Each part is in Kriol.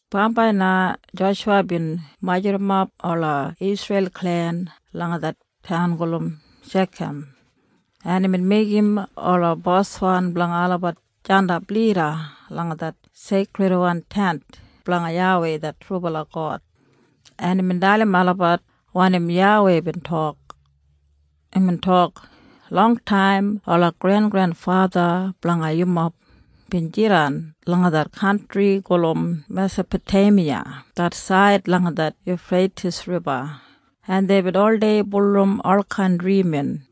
Bambai na Joshuwa bin majurrumap ola Isreil klen langa det taun gulum Shekam, en imbin meigim ola boswan blanga olabat jandap lida langa det Seikridwan Tent blanga YAWEI det trubala God, en imbin dalim olabat wanim YAWEI bin tok. Imbin tok, “Longtaim ola grengrenfatha blanga yumob bin jidan langa det kantri gulum Mesapoteimiya det said langa det Yufreitis Riba, en deibin oldei bulurrum olkain drimin.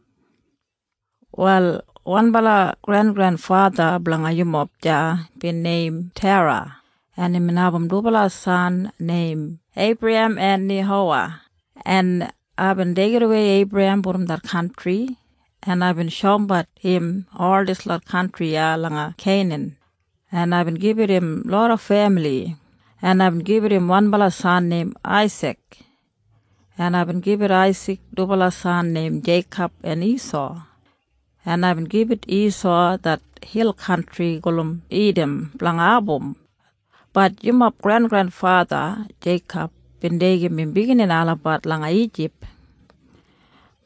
“Wal wanbala grengrenfatha blanga yumob deya bin neim Tera, en imbin abum dubala san neim Eibrahem en Neihowa, en aibin deigidawei Eibrahem brom det kantri, en aibin shoumbat im ol dislot kantri iya langa Keinan, en aibin gibit im loda femili, en aibin gibit im wanbala san neim Aisik, en aibin gibit Aisik dubala san neim Jeikob en Isau, en aibin gibit Isau det hil kantri gulum Idam blanga abum. Bat yumob grengrenfatha Jeikob bin deigim im biginini olabat langa Ijip.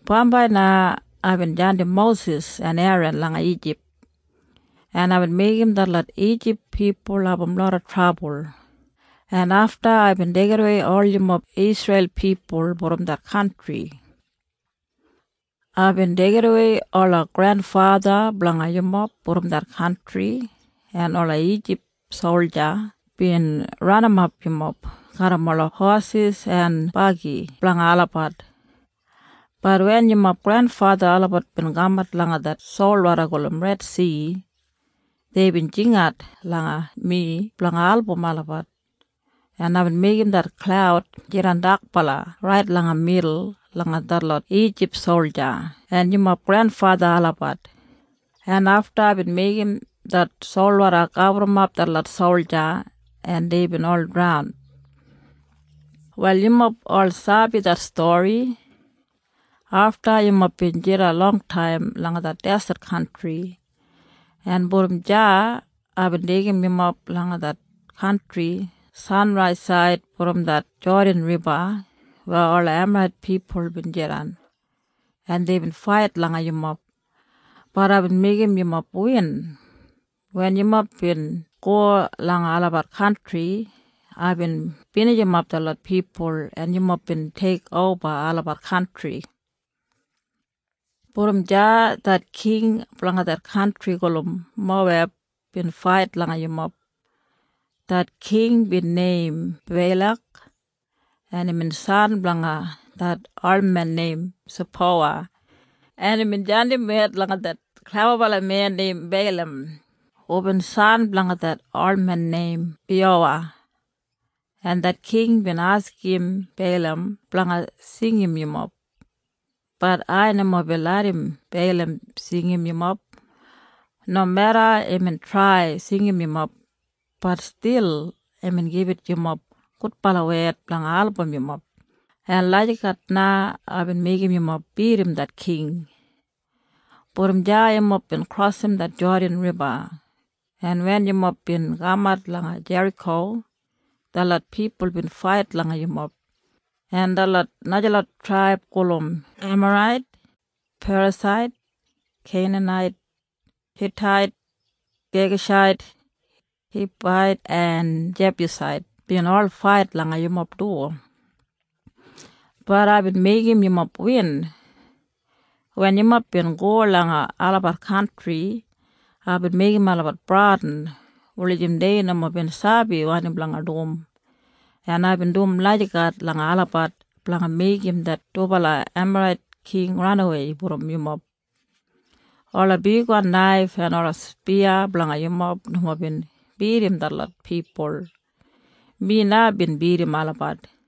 Bambai na aibin jandim Mosis en Eran langa Ijip, en aibin meigim detlot Ijip pipul abum loda trabul, en afta aibin deigidawei ol yumob Isreil pipul brom det kantri. Aibin deigidawei ola grenfatha blanga yumob brom det kantri, en ola Ijip solja bin ranimap yumob garram ola hosis en bagi blanga olabat. Bat wen yumob grenfatha olabat bin kamat langa det solwoda gulum Redsi, deibin jingat langa mi blanga album olabat, en aibin meigim det klaud jidan dakbala rait langa midul langa detlot Ijip solja en yumob grenfatha olabat, en afta aibin meigim det solwoda gaburrumap detlot solja en deibin ol draun. “Wal yumob ol sabi det stori. Afta yumob bin jidan longtaim langa det deset kantri, en brom deya aibin deigim yumob langa det kantri sanraisaid brom det Jodan Riba weya ola Emarait pipul bin jidan, en deibin fait langa yumob. Bat aibin meigim yumob win. Wen yumob bin go langa olabat kantri, aibin binijimap detlot pipul, en yumob bin teikoba olabat kantri. “Brom deya det king blanga det kantri gulum Moweb bin fait langa yumob. Det king bin neim Beilak, en imbin san blanga det olmen neim Sipowa, en imbin jandim wed langa det klebabalamen neim Beilam, hubin san blanga det olmen neim Biyowa, en det king bin askim Beilam blanga singim yumob. Bat ai nomo bin larram Beilam singim yumob. Nomeda imbin trai singim yumob, bat stil imbin gibit yumob gudbala wed blanga album yumob, en lagijat na aibin meigim yumob bidim det king. “Brom deya yumob bin krosim det Jodan Riba, en wen yumob bin kamat langa Jeriko, detlot pipul bin fait langa yumob, en detlot najalot traib gulum Emarait, Perasait, Keinanait, Hitait, Gegashait, Hibait en Jebusait bin ol fait langa yumob du. Bat aibin meigim yumob win. Wen yumob bin go langa olabat kantri, aibin meigim olabat bradin, wulijim dei nomo bin sabi wanim blanga dum. En aibin dum lagijat langa olabat blanga meigim det dubala Emarait king ranawei brom yumob. Ola bigwan naif en ola spiya blanga yumob nomo bin bidim detlot pipul. Mi na bin bidim olabat.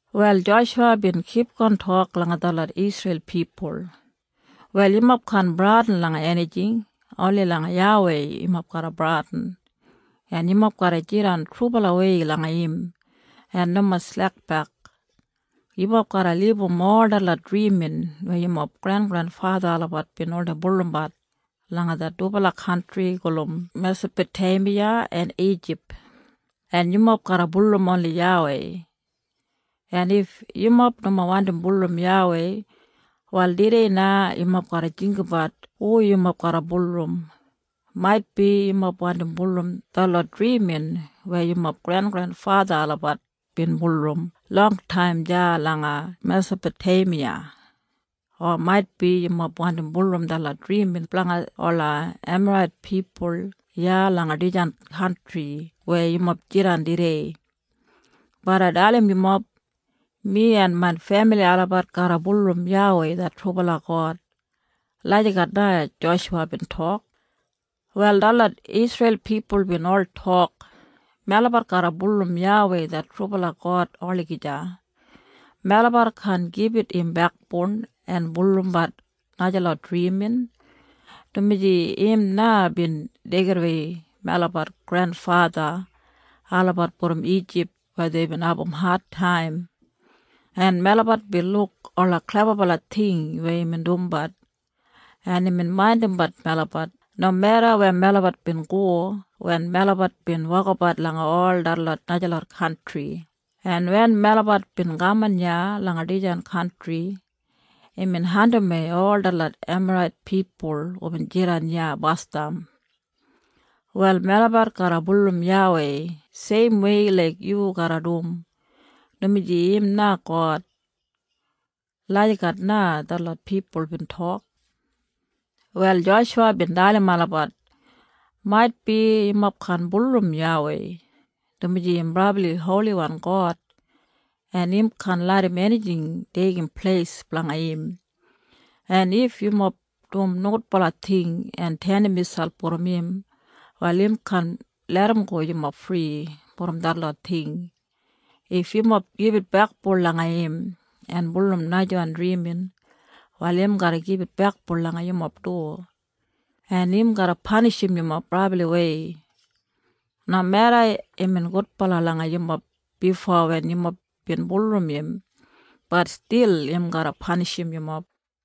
Wal Joshuwa bin kipgon tok langa detlot Isreil pipul, “Wal yumob kaan bradin langa enijing. Oni langa YAWEI yumob garra bradin. En yumob garra jidan trubalawei langa im en nomo slekbek. Yumob garra libum ol detlot drimin weya yumob grengrenfatha olabat bin oldei bulurrumbat langa det dubala kantri gulum Mesapoteimiya en Ijip, en yumob garra bulurrum oni YAWEI. En if yumob nomo wandi bulurrum YAWEI, wal tudei na yumob garra jinggabat hu yumob garra bulurrum. Maitbi yumob wandim bulurrum detlot drimin weya yumob grengrenfatha olabat bin bulurrum longtaim deya langa Mesapoteimiya, o maitbi yumob wandi bulurrum detlot drimin blanga ola Emarait pipul iya langa dijan kantri weya yumob jidan tudei. Bat ai dalim yumob. Mi en main femili olabat garra bulurrum YAWEI det trubala God.” Lagijat na Joshuwa bin tok. Wal detlot Isreil pipul bin ol tok, “Melabat garra bulurrum YAWEI det trubala God olagija. Melabat kaan gibit im bekboun en bulurrumbat najalot drimin, dumaji im na bin deigidawei melabat grenfatha olabat brom Ijip weya deibin abum adtaim, en melabat bin luk ola klebabala ting weya imbin dumbat, en imbin maindimbat melabat nomeda weya melabat bin go wen melabat bin wokabat langa ol detlot najalot kantri, en wen melabat bin kaman iya langa dijan kantri, imbin andimwei ol detlot Emarait pipul hubin jidan iya basdam. Wal melabat garra bulurrum YAWEI seimwei laik yu garra dum, dumaji im na God.” Lagijat na detlot pipul bin tok. Wal Joshuwa bin dalim olabat, “Maitbi yumob kaan bulurrum YAWEI, dumaji im brabli holiwan God, en im kaan larram enijing deigim pleis blanga im, en if yumob dum nogudbala ting en tenim miselp brom im, wal im kaan larramgo yumob fri brom detlot ting. If yumob gibit bekboun langa im en bulurrum najawan drimin, wal im garra gibit bekboun langa yumob du, en im garra panishim yumob brabliwei. Nomeda imbin gudbala langa yumob bifo wen yumob bin bulurrum im, bat stil im garra panishim yumob.”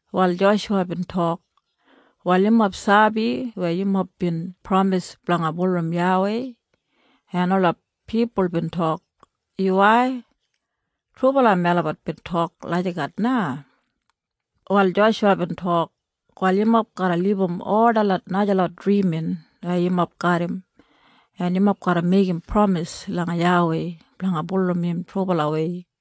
Wal Joshuwa bin tok, “Wal yumob sabi weya yumob bin pramis blanga bulurrum YAWEI.” En ola pipul bin tok, “Yuwai. Trubala melabat bin tok lagijat na.” Wal Joshuwa bin tok, “Wal yumob garra libum ol detlot najalot drimin weya yumob garram, en yumob garra meigim pramis langa YAWEI blanga bulurrum im trubalawei.”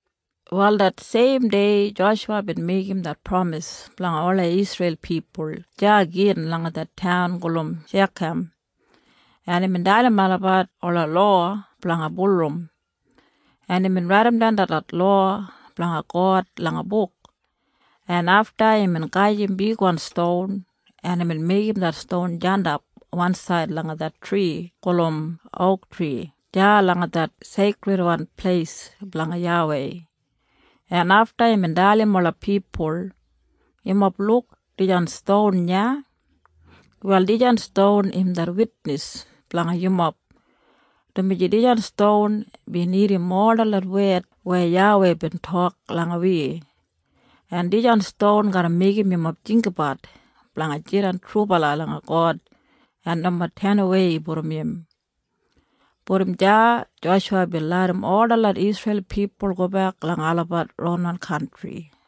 Wal det seim dei Joshuwa bin meigim det pramis blanga ola Isreil pipul deya gin langa det taun gulum Shekam, en imbin dalim olabat ola lowa blanga bulurrum, en imbin raidimdan detlot lowa blanga God langa buk, en afta imbin gajim bigwan ston, en imbin meigim det ston jandap wansaid langa det tri gulum ouktri deya langa det Seikridwan Pleis blanga YAWEI, en afta imbin dalim ola pipul, “Yumob luk dijan ston iya? Wal dijan ston im det witnis blanga yumob, dumaji dijan ston bin irrim ol detlot wed weya YAWEI bin tok langa wi, en dijan ston garra meigim yumob jinggabat blanga jidan trubala langa God en nomo tenawei brom im.” Brom deya Joshuwa bin larram ol detlot Isreil pipul gobek langa olabat ronwan kantri.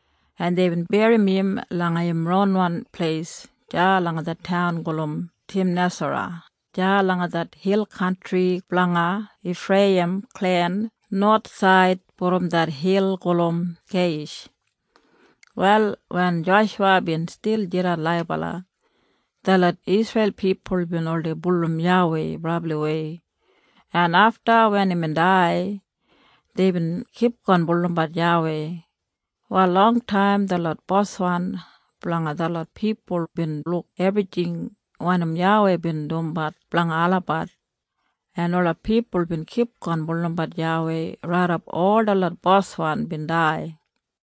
en deibin berrim im langa im ronwan pleis deya langa det taun gulum Timnasera deya langa det hil kantri blanga Ifreiyim klen nowathsaid brom det hil gulum Geiyish. Wal wen Joshuwa bin stil jidan laibala, detlot Isreil pipul bin oldei bulurrum YAWEI brabliwei, en afta wen imbin dai, deibin kipgon bulurrum YAWEI. Wal longtaim detlot boswan blanga detlot pipul bin luk ebrijing wanim YAWEI bin dumbat blanga olabat, en ola pipul bin kipgon bulurrumbat YAWEI raidap ol detlot boswan bin dai.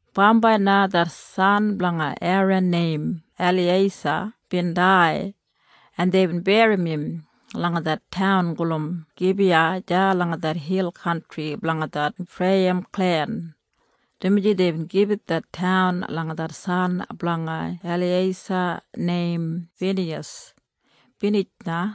Bambai na det san blanga Eran neim Eliyeisa bin dai, en deibin berrim im langa det taun gulum Gibiya deya langa det hil kantri blanga det Ifreiyim klen, dumaji deibin gibit det taun langa det san blanga Eliyeisa neim Finiyas. Binij na.